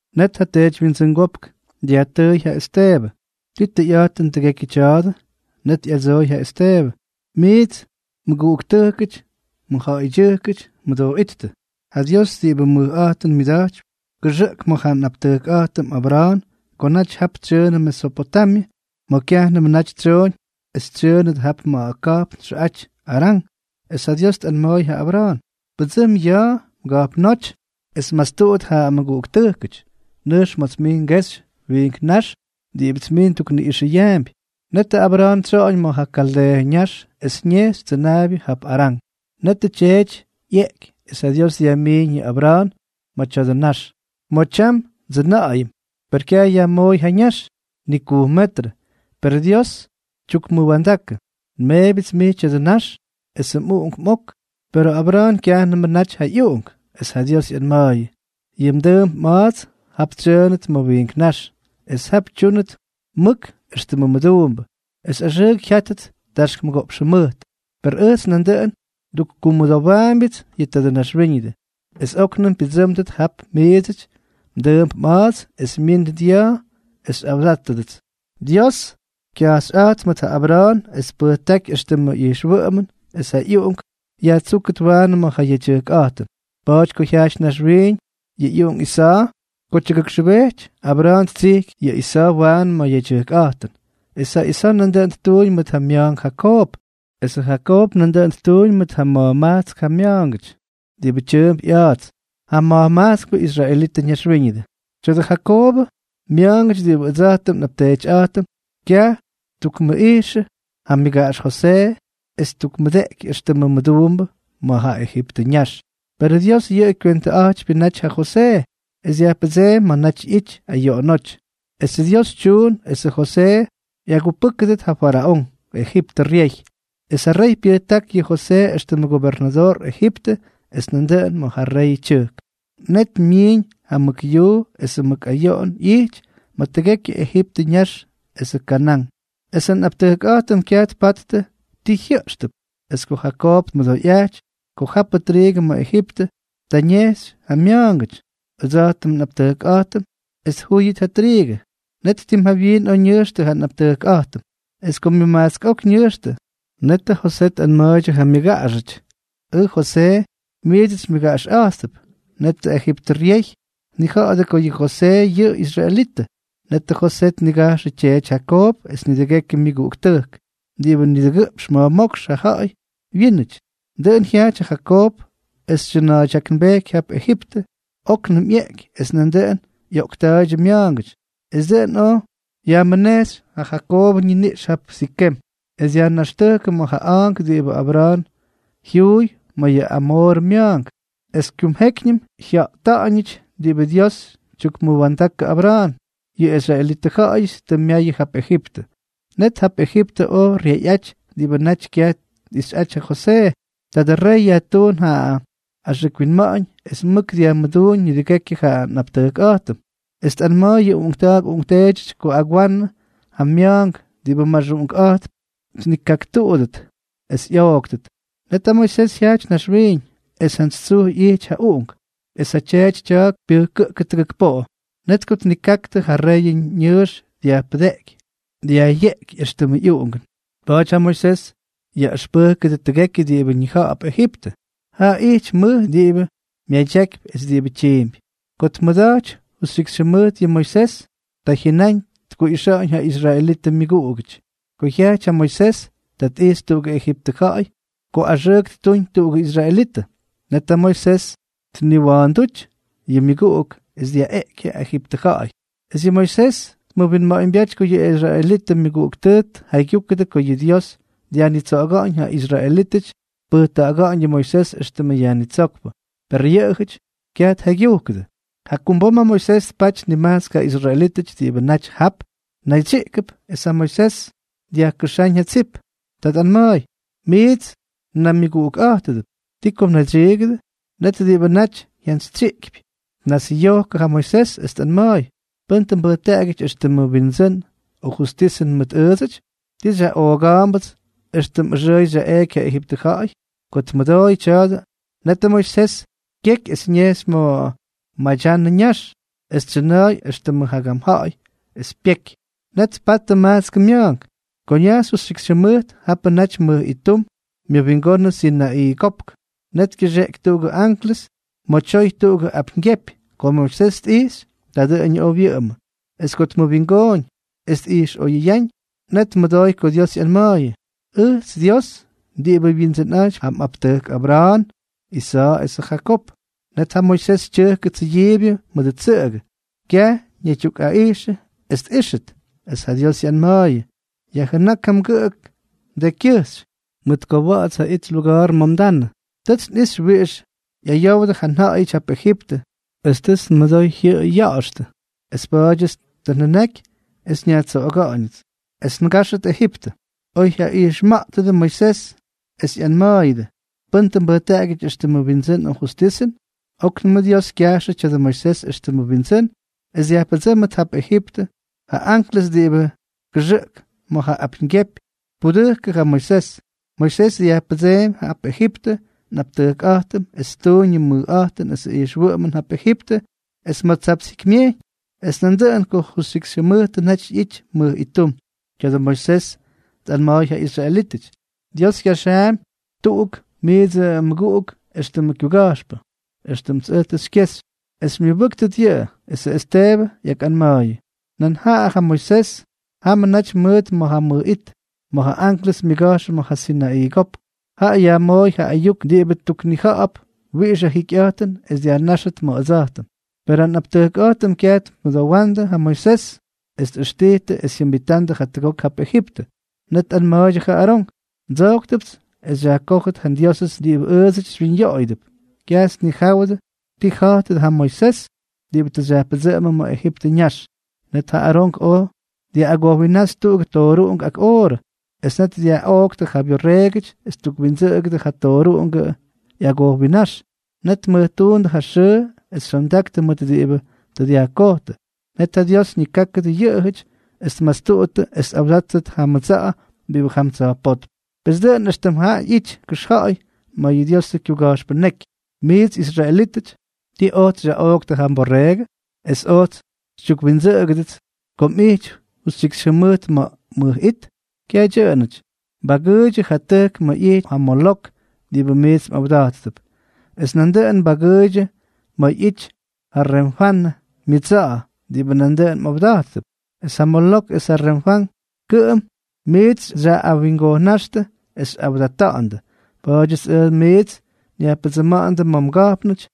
Net ja teedywyindsʉngópk dyajtʉʉy ja Esteebʉ: —¿Tii tʉyꞌa̱jtʉn tʉgekyʉ tya̱a̱dʉ? Net ꞌyadsooy ja Esteebʉ: —Miits mʉguꞌuktʉjkʉty, mʉjja̱ꞌa̱ydyʉjkʉty, mʉdooꞌíttʉ. Ja Dios diꞌibʉ mʉjꞌa̱jtʉn myʉda̱jtypy, kʉxʉꞌk ma̱ ja nꞌapteetyꞌa̱jtʉm Abra̱a̱n ko naty jap tsyʉʉnʉ Mesopotamyʉ, ma̱ kyajnʉmʉ naty tsyooñ es tsyʉʉnʉt jap ma̱ ka̱jpn txʉꞌaty Arán. Es ja Dios tꞌanma̱a̱y ja Abra̱a̱n: “Pʉdsʉm ya̱a̱ mga̱jpnóty es mastuꞌut ja mmʉguꞌuktʉjkʉty. Nʉjx ma̱ts mij ngexy wiink nax diꞌibʉts mij ndukniꞌꞌixʉyaampy.” Netʉ Abra̱a̱n tsyoꞌoñ ma̱ ja Kaldeeʉ ñax es ñejxy tsʉnaabyʉ jap Arán. Netʉ tyeety ꞌyeꞌky, es ja Dios dyajmiiñ yʉ Abra̱a̱n ma̱ tya̱dʉ nax, ma̱ tyam ndsʉna̱ꞌa̱yʉm. Per kyaj yajmooy ja ñax, ni kujm metrʉ. Per Dios tyukmʉwa̱ndakʉ: “Nmeebyʉts mij tya̱dʉ nax esʉ mꞌuꞌunk mꞌok.” Perʉ Abra̱a̱n kyajnʉmʉ naty ja ꞌyuꞌunk, es ja Dios ꞌyanma̱a̱yʉ: “Yʉ mdʉʉmp mꞌa̱a̱ts jap tsyʉʉnʉt ma̱ wiink nax, es jap tyúnʉt mʉk éxtʉmʉ mʉduumbʉ, es axʉʉk jyátʉt taxk mʉgoꞌpx jʉmʉjt. Per ʉjts nandʉꞌʉn ndukkumʉdowaambyʉts yʉ tadʉ naxwíñʉdʉ, es óknʉm pyʉdsʉ́mdʉt jap miidsʉ mdʉʉmp mꞌa̱a̱ts es myíndʉt ya̱a̱ es xyꞌawdátʉdʉts.” Dios kyajxyꞌa̱jt mʉt ja Abra̱a̱n es tpʉjtáky éxtʉmʉ ijxwʉꞌʉmʉn es ja ꞌyuꞌunk yajtsúkʉt waanʉ ma̱ ja yedyʉjkꞌa̱jtʉn. Pa̱a̱ty ko jyajty naxwiiñ yʉ ꞌyuꞌunk Isa̱a̱, ko tyuktujkxʉbejty Abra̱a̱n ttsijky yʉ Isa̱a̱ waanʉ ma̱ ja yedyʉjkꞌa̱jtʉn. Es ja Isa̱a̱ nandʉꞌʉn ttuuñ mʉt ja mya̱a̱nk Jakoob, esʉ Jakoob nandʉꞌʉn ttuuñ mʉt ma̱jmajtsk ja mya̱a̱ngʉty, diꞌibʉ tyʉʉmp ꞌya̱a̱ts ja ma̱jmajtskpʉ israelitʉ ñaxwíñʉdʉ. ’Tya̱dʉ Jakoobʉ mya̱a̱ngʉty diꞌibʉ ʉdsa̱jtʉm nꞌapteetyꞌa̱jtʉm, kyaj ttukmʉjꞌijxʉ ja myʉgaꞌax Josee es ttukmʉdeꞌky éxtʉmʉ mʉduumbʉ ma̱ yʉ Ejiptʉ ñax. Perʉ Dios yʉꞌʉ kywentʉꞌa̱jtypyʉ naty ja Josee, es dyajpʉdseemy ma̱ naty ꞌyity ayoꞌonóty. Esʉ Dios tyuun esʉ Josee ꞌyagupʉ́kʉdʉt ja faraón, Ejiptʉ ryey. Es ja rey pyʉjták yʉ Josee éxtʉmʉ gobernadoor Ejiptʉ es nandʉꞌʉn ma̱ ja reyʉ tyʉjk. ’Net myiiñ ja mʉk yuu, esʉ mʉk ayoꞌon ꞌyijty ma̱ tʉgekyʉ Ejiptʉ ñax es Kanán, esʉ nꞌaptʉjkꞌa̱jtʉm kyaj tpattʉ ti jyʉꞌxtʉp. Es ko Jakoob tmʉdoyꞌajty ko japʉ triigʉ ma̱ Ejiptʉ, ta tkejxy ja mya̱a̱ngʉty, ʉdsa̱jtʉm nꞌaptʉjkꞌa̱jtʉm, es tjúyʉt ja triigʉ. Net tim jawyiin oj ñʉjxtʉ ja nꞌaptʉjkꞌa̱jtʉm. Es ko myʉmajtsk ok ñʉjxtʉ, netʉ Josee tꞌanma̱a̱ydyʉ ja myʉgaꞌaxʉty: “Ʉj Josee, miits xymyʉgaꞌaxꞌa̱jttʉp.” Net ja Ejiptʉ ryey tnija̱ꞌa̱jʉ ko yʉ Josee yʉꞌʉ israelitʉ. Net ja Josee tnigajxʉ tyeety Jakoob es nidʉgekyʉ myʉguꞌuktʉjk, diꞌibʉ nidʉgʉꞌpx ma̱jmókx ja ja̱ꞌa̱y wyínʉty. Dʉꞌʉn jyajty ja Jakoob es tsyʉna̱a̱ydyaknbejky jap Ejiptʉ. Oknʉm ꞌyeꞌky, es nandʉꞌʉn ꞌyoꞌkta̱a̱ydyʉ mya̱a̱ngʉty. Es dʉꞌʉn oj yajmʉnejxy ja Jakoobʉ ñiniꞌx jap Sikem, es dyajnaxtʉjkʉ ma̱ ja a̱a̱nk diꞌibʉ Abra̱a̱n jyuuy ma̱ yʉ Amoorʉ mya̱a̱nk. ’Es kumjékyñʉm jyata̱ꞌa̱ñʉty diꞌibʉ Dios tyukmʉwa̱ndakʉ Abra̱a̱n, yʉ israelitʉ ja̱ꞌa̱yʉty tʉ myayʉ jap Ejiptʉ. Net jap Ejiptʉ oj ryeyꞌaty diꞌibʉ naty kyaj tꞌixyꞌaty ja Josee. Tadʉ rey yajtuun ja axʉk winma̱ꞌa̱ñ es mʉk dyajmʉduuñ nidʉgekyʉ ja nꞌaptʉjkꞌa̱jtʉm. Es tꞌanma̱a̱y yʉ uꞌunkta̱a̱k uꞌunkteedyʉty ko agwanʉ ja mya̱a̱nk diꞌibʉ maxuꞌunkꞌa̱jtp, tnikaꞌaktʉt es ꞌyooktʉt. Net ja Moisés jyajty naxwiiñ. Es jantsy tsuj ijty ja uꞌunk, es ja tyeety tya̱a̱k pyʉjkʉꞌkʉ tʉgʉk poꞌo. Net ko tnikaktʉ, ja reyʉ ñʉʉx dyajpʉdeꞌky es dyajꞌyeꞌky éxtʉmʉ ꞌyuꞌungʉn. Pa̱a̱ty ja Moisés yaꞌʉxpʉjkʉdʉ tʉgekyʉ diꞌibʉ ñija̱ꞌa̱p Ejiptʉ. Jaꞌa ijty mʉj diꞌibʉ myadyakypy es diꞌibʉ tyiimpy. ’Ko tmʉda̱jty justyikxy jʉmʉjt yʉ Moisés, ta jyʉnáñ tkuꞌixa̱ꞌa̱ñ ja israelitʉ myʉguꞌugʉty. Ko jyajty ja Moisés, ta tꞌijxy tuꞌugʉ Ejiptʉ ja̱ꞌa̱y ko axʉʉk ttuñ tuꞌugʉ israelitʉ. Net ja Moisés tniwa̱a̱ndúty yʉ myʉguꞌuk es dyaꞌeꞌky ja Ejiptʉ ja̱ꞌa̱y. Es yʉ Moisés tmʉwinma̱ꞌa̱ñbyáty ko yʉ israelitʉ myʉguꞌuktʉjk tʉ tjaygyúkʉdʉ ko yʉ Dios dyajtsoꞌoga̱ꞌa̱ñ ja israelítʉty es tpʉjta̱ꞌa̱ga̱ꞌa̱ñ yʉ Moisés éxtʉmʉ yajnitsókpʉ. Per yʉꞌʉjʉty kyaj tjaygyujkʉdʉ. ’Jakumbom ja Moisés tpaty nimajtsk ja israelítʉty diꞌibʉ naty jap naydsyiꞌkʉp, es ja Moisés dyajkʉxáñ ja tsip. Ta tꞌanma̱a̱y: “Miits mnaymyʉguꞌukꞌa̱jtʉdʉp. ¿Ti ko mnaydsyiigʉdʉ?” Net diꞌibʉ naty jyantsytsyiꞌkypy tnasꞌyojkʉdʉ ja Moisés, es tꞌanma̱a̱y: “¿Pʉ́n tʉ mbʉjtaꞌagyʉty éxtʉmʉ windsʉnʉn o justisʉn mʉt ʉʉdsʉty? ¿Ti xyaꞌooga̱a̱mbʉts, éxtʉm ʉxʉꞌʉy xyaꞌeꞌky ja Ejiptʉ ja̱ꞌa̱y?” Ko tmʉdooyʉ tya̱a̱dʉ, netʉ Moisés kyeky es ñejxy ma̱ Madyanʉ ñax. Jap tsyʉna̱a̱y éxtʉmʉ jagam ja̱ꞌa̱y es pyejky. Net tpattʉ majtskʉ mya̱a̱nk. ’Ko ñajxy justyikxy jʉmʉjt, japʉ naty mʉj ittum myʉwingonʉ Sinaꞌii Kopk, net kyʉxeꞌky tuꞌugʉ anklʉs ma̱ tyoy tuꞌugʉ apyñgyepy. Ko Moisés tꞌijxy, ta dʉꞌʉñʉ oj wyʉꞌʉmʉ. Es ko tmʉwingooñ es tꞌijxꞌoyʉyáñ, net tmʉdooy ko Dios ꞌyanma̱a̱yʉ: “Ʉjts Dios diꞌibʉ Wyindsʉnꞌa̱jtypy ja mꞌaptʉjk Abra̱a̱n, Isa̱a̱ esʉ Jakoob.” Net ja Moisés tyʉjkʉ tsʉyiibyʉ mʉdʉ tsʉꞌʉgʉ, kyaj ñaydyukꞌaꞌijxʉ es tꞌíxʉt. Es ja Dios ꞌyanma̱a̱yʉ: “Yajjʉnák ja mgʉꞌʉk mdekykyʉjxy, mʉt ko wa̱ꞌa̱ts ja it luga̱a̱r ma̱ mdanʉ. Tʉts nꞌixy wiꞌix ꞌyayowdʉ ja nja̱ꞌa̱yʉty jap Ejiptʉ, es tʉts nmʉdoy jyʉꞌʉy ya̱ꞌa̱xtʉ. Es pa̱a̱dyʉts tʉ njʉnaky es nyajtsoꞌoga̱ꞌa̱ñʉts. Pes min es ngáxʉt Ejiptʉ.” ’Oyjyaꞌijxma̱ꞌtʉdʉ Moisés es ꞌyanma̱a̱yʉdʉ: “¿Pʉ́n tʉ mbʉjtaꞌagyʉty éxtʉmʉ windsʉ́n o justisʉn?”, óknʉm Dios kyajxʉ tya̱dʉ Moisés éxtʉmʉ windsʉ́n es dyajpʉdsʉ́mʉt jap Ejiptʉ, ja anklʉs diꞌibʉ kʉxʉꞌk ma̱ ja apyñgyepy tpudʉjkʉ ja Moisés. Moisés dyajpʉdseemy jap Ejiptʉ nꞌaptʉjkꞌa̱jtʉm es ttuuñ yʉ mʉjꞌa̱jtʉn esʉ ijxwʉꞌʉmʉn jap Ejiptʉ es ma̱ Tsapts Jikymyejyñ, es nandʉꞌʉn ko justyikxy jʉmʉjtʉ naty ꞌyity mʉj ittum. Tya̱dʉ Moisés tꞌanma̱a̱y ja israelítʉty: “Dios kyaxaampy tuꞌuk miidsʉ mmʉguꞌuk éxtʉmʉ kyuga̱jxpʉ, éxtʉmts ʉj tʉ xykyexy. Es xymyʉbʉ́ktʉt yʉꞌʉ.” Esʉ Esteebʉ ꞌyakꞌanma̱a̱yʉ: —Nan jaꞌa ja Moisés, jamʉ naty mʉʉt ma̱ ja mʉj it, ma̱ ja anklʉs myʉga̱jxʉ ma̱ ja Sinaꞌii Kopk. Jaꞌa yajmooy ja ayuk diꞌibʉ tuknija̱ꞌa̱p wiꞌix ja jikyꞌa̱jtʉn es dyajnáxʉt ma̱ ʉdsa̱jtʉm. Perʉ nꞌaptʉjkꞌa̱jtʉm kyaj tmʉmʉdowandʉ ja Moisés, es tꞌʉxtijtʉ es jyajʉmbitandʉ jatʉgok jap Ejiptʉ. Net tꞌanma̱a̱ydyʉ ja Arón: “Ndsojktʉpts es xyajkójʉt ja ndiósʉts diꞌibʉ ʉʉdsʉty xywyinyoꞌoyʉdʉp. Kyajts nnijáwʉdʉ ti ja̱jtʉ tadʉ Moisés diꞌibʉ tʉ xyajpʉdsʉꞌʉmʉm ma̱ Ejiptʉ ñax.” Net ja Arón oj dyaꞌꞌagojwinnáxy tuꞌugʉ tooruꞌunk ak oorʉ. Es net dyaꞌoꞌktʉ ja byorreegʉty es ttukwindsʉꞌkʉdʉ ja tooruꞌungʉ ꞌyagojwinnáx. Net tmʉjtuundʉ ja xʉʉ es xyondaktʉ mʉt diꞌibʉ tʉ dyajkojtʉ. Net ja Dios ñikákʉdʉ yʉꞌʉjʉty es tmastuttʉ es tꞌawdáttʉt ja mʉdsa̱ꞌa̱ diꞌibʉ jam tsa̱jpótm. Pes dʉꞌʉn éxtʉm jap ꞌyity kʉxja̱ꞌa̱y ma̱ yʉ Diosʉ kyuga̱jxpʉ ñeky: Miits israelítʉty, ¿ti ojts xyaꞌooktʉ ja mborreegʉ, es ojts xytyukwindsʉꞌkʉdʉts ko mꞌijty justyikxy jʉmʉjt ma̱ ja mʉj it? Kyaj dyʉꞌʉnʉty, mbagʉʉydyʉ ja tʉjk ma̱ ꞌyity ja Molok diꞌibʉ miits mꞌawda̱jttʉp, es nandʉꞌʉn mbagʉʉydyʉ ma̱ ꞌyity ja Renfanʉ myʉdsa̱ꞌa̱, diꞌibʉ nandʉꞌʉn mꞌawda̱jttʉp. Es ja Molok es ja Renfán, kʉꞌʉm miits xyaꞌꞌawingojna̱jxtʉ es xyꞌawdata̱ꞌa̱ndʉ. Pa̱a̱dyʉts ʉj miits nyajpʉdsʉma̱ꞌa̱ndʉ ma̱ mga̱jpnʉty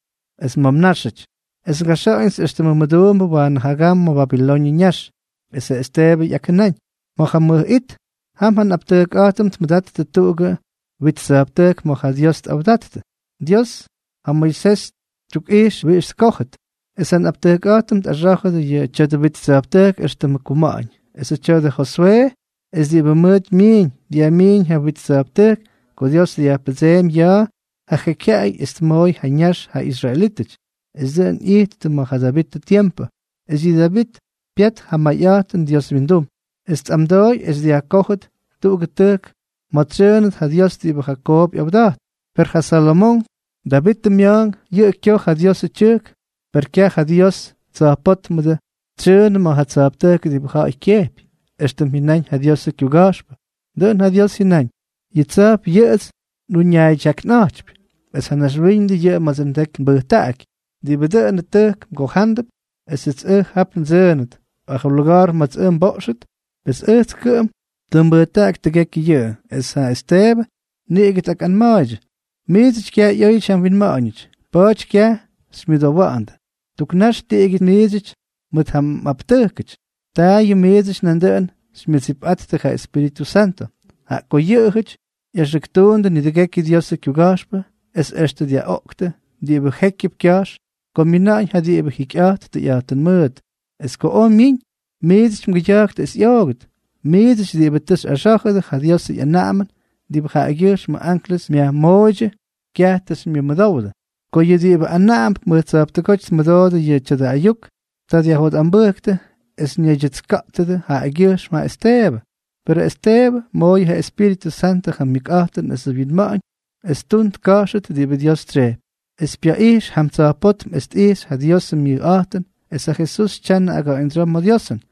es ma̱ mnáxʉty, es ngaxa̱ꞌa̱ñʉts éxtʉmʉ mʉduumbʉ waanʉ jagam ma̱ Babiloñʉ ñax. Esʉ Esteebʉ ꞌyakjʉnáñ: —Ma̱ ja mʉj it, jam ja nꞌaptʉjkꞌa̱jtʉm tmʉda̱jttʉ tuꞌugʉ wit tsa̱jptʉjk ma̱ ja Dios tꞌawda̱jttʉ. Dios ja Moisés tyukꞌijxʉ wiꞌix tkójʉt. Es ja nꞌaptʉjkꞌa̱jtʉm tꞌaxá̱jʉdʉ yʉ tya̱dʉ wit tsa̱jptʉjk éxtʉmʉ kuma̱ꞌa̱ñ. Esʉ tya̱dʉ Joswee es diꞌibʉ mʉʉt myiiñ, dyajmiiñ ja wit tsa̱jptʉjk ko Dios dyajpʉdseemy ya̱a̱ ja jekyjyaꞌay es tmooy ja ñax ja israelítʉty. Es dʉꞌʉn ꞌyijttʉ ma̱ ja Davitʉ tiempʉ. Es yʉ Davit pyat ja mayꞌa̱jtʉn Dios wyindum, es ꞌyamdooy es dyajkójʉt tuꞌugʉ tʉjk ma̱ tsyʉʉnʉt ja Dios diꞌibʉ Jakoob ꞌyawda̱jt. Per ja Salomonk, Davitʉ mya̱a̱nk, yʉꞌʉ kyoj ja Diosʉ tyʉjk. Per kyaj ja Dios Tsa̱jpótmʉdʉ tsyʉʉnʉ ma̱ ja tsa̱jptʉjk diꞌibʉ ja̱ꞌa̱y kyejpy. Extʉm jyʉnáñ ja Diosʉ kyuga̱jxpʉ: Dʉꞌʉn ja Dios jyʉnaꞌañ: “Yʉ tsa̱jp yʉꞌʉts nꞌuñaaydyaknꞌa̱jtypy, es ja naxwíñʉdʉ yʉꞌʉ ma̱dsʉ ndeky nbʉjtaꞌaky. ¿Diꞌibʉ dʉnʉ tʉjk mgojándʉp esʉts ʉj jap ndsʉʉnʉt, o ja luga̱a̱r ma̱ts ʉj nboꞌxʉt? Pes ʉjts kʉꞌʉm tʉ nbʉjtaꞌaky tʉgekyʉ yʉꞌʉ.” Es ja Esteebʉ niꞌigʉ tꞌakꞌanma̱a̱ydyʉ: —Miidsʉty kyaj ꞌyóyʉty ja mwinma̱ꞌa̱ñʉty, pa̱a̱ty kyaj xymyʉdowa̱ꞌa̱ndʉ. Tuk nax tiꞌigyʉty miidsʉty mʉt ja mꞌaptʉjkʉty, taayʉm miidsʉty nandʉꞌʉn xymyʉdsipꞌattʉ ja Espíritʉ Santʉ. Jaꞌa ko yʉꞌʉjʉty ꞌyaxʉktuundʉ nidʉgekyʉ Diosʉ kyuga̱jxpʉ es extʉ dyaꞌoꞌktʉ diꞌibʉ jékyʉp kya̱jx ko myina̱ꞌa̱ñ ja diꞌibʉ jikyꞌa̱jt tʉyꞌa̱jtʉn mʉʉt. Es ko oj myiñ, miits mgʉya̱jktʉ es ꞌyoogʉt. ¡Miidsʉty diꞌibʉ tʉ tꞌaxá̱jʉdʉ ja Diosʉ ꞌyanaꞌamʉn diꞌibʉ jaꞌagyʉjxmʉ anklʉs myajmooydyʉ, kyaj tʉ xymyʉmʉdowdʉ! Ko yʉ diꞌibʉ anaꞌamdʉp mʉj tsa̱jptʉgóty tmʉdoodʉ yʉ tya̱dʉ ayuk, ta jyotꞌambʉjktʉ es ñaydyʉtska̱ꞌtʉdʉ jaꞌagyʉjxm ja Esteebʉ. Perʉ Esteebʉ, mooyʉ ja Espíritʉ Santʉ ja mʉkꞌa̱jtʉn esʉ winma̱ꞌa̱ñ es ttun tka̱jxʉt diꞌibʉ Dios tsyejpy, es pyatꞌijxy jam tsa̱jpótm es tꞌijxy ja Diosʉ myʉjꞌa̱jtʉn, es ja Jesús tyanʉ aga̱ꞌa̱ñdsyoo ma̱ Diosʉn.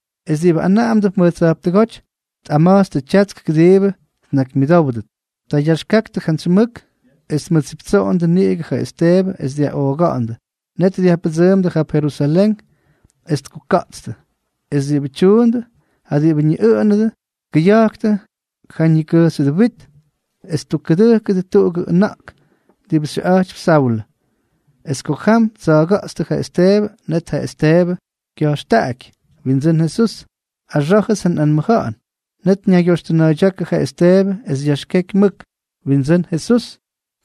Es diꞌibʉ anaꞌamdʉp mʉj tsa̱jptʉgóty tꞌama̱jtstʉ tyatsk kʉdiibʉ tnakymyʉdówdʉt. Ta yaxkaktʉ jantsy mʉk es tmʉdsiptsoꞌondʉ niꞌigʉ ja Esteebʉ es dyaꞌooga̱ꞌa̱ndʉ. Net dyajpʉdsʉʉmdʉ jap Jerusalén es tkuka̱ꞌtstʉ. Es diꞌibʉ tyuundʉ, ja diꞌibʉ ñiꞌʉꞌʉnʉdʉ, tkʉya̱jktʉ ja ñikʉjxyʉdʉ wit es ttukkʉdʉjkʉdʉ tuꞌugʉ ʉna̱ꞌk diꞌibʉ xyʉꞌa̱jtypy Saulʉ. Es ko jam ttsa̱a̱ga̱ꞌtstʉ ja Esteebʉ, net ja Esteebʉ kya̱jxtaꞌaky: —Windsʉ́n Jesús, axá̱jʉts ja nꞌanmʉja̱ꞌa̱n. Net ñaygyoxtʉna̱a̱ydyákʉ ja Esteebʉ es yaxkeky mʉk: —Windsʉ́n Jesús,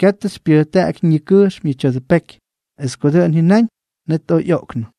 katʉ xypyʉjtaꞌaky ñikʉjxm yʉ tya̱dʉ peky. Es ko dʉꞌʉn jyʉnáñ, net oj ꞌyoꞌknʉ.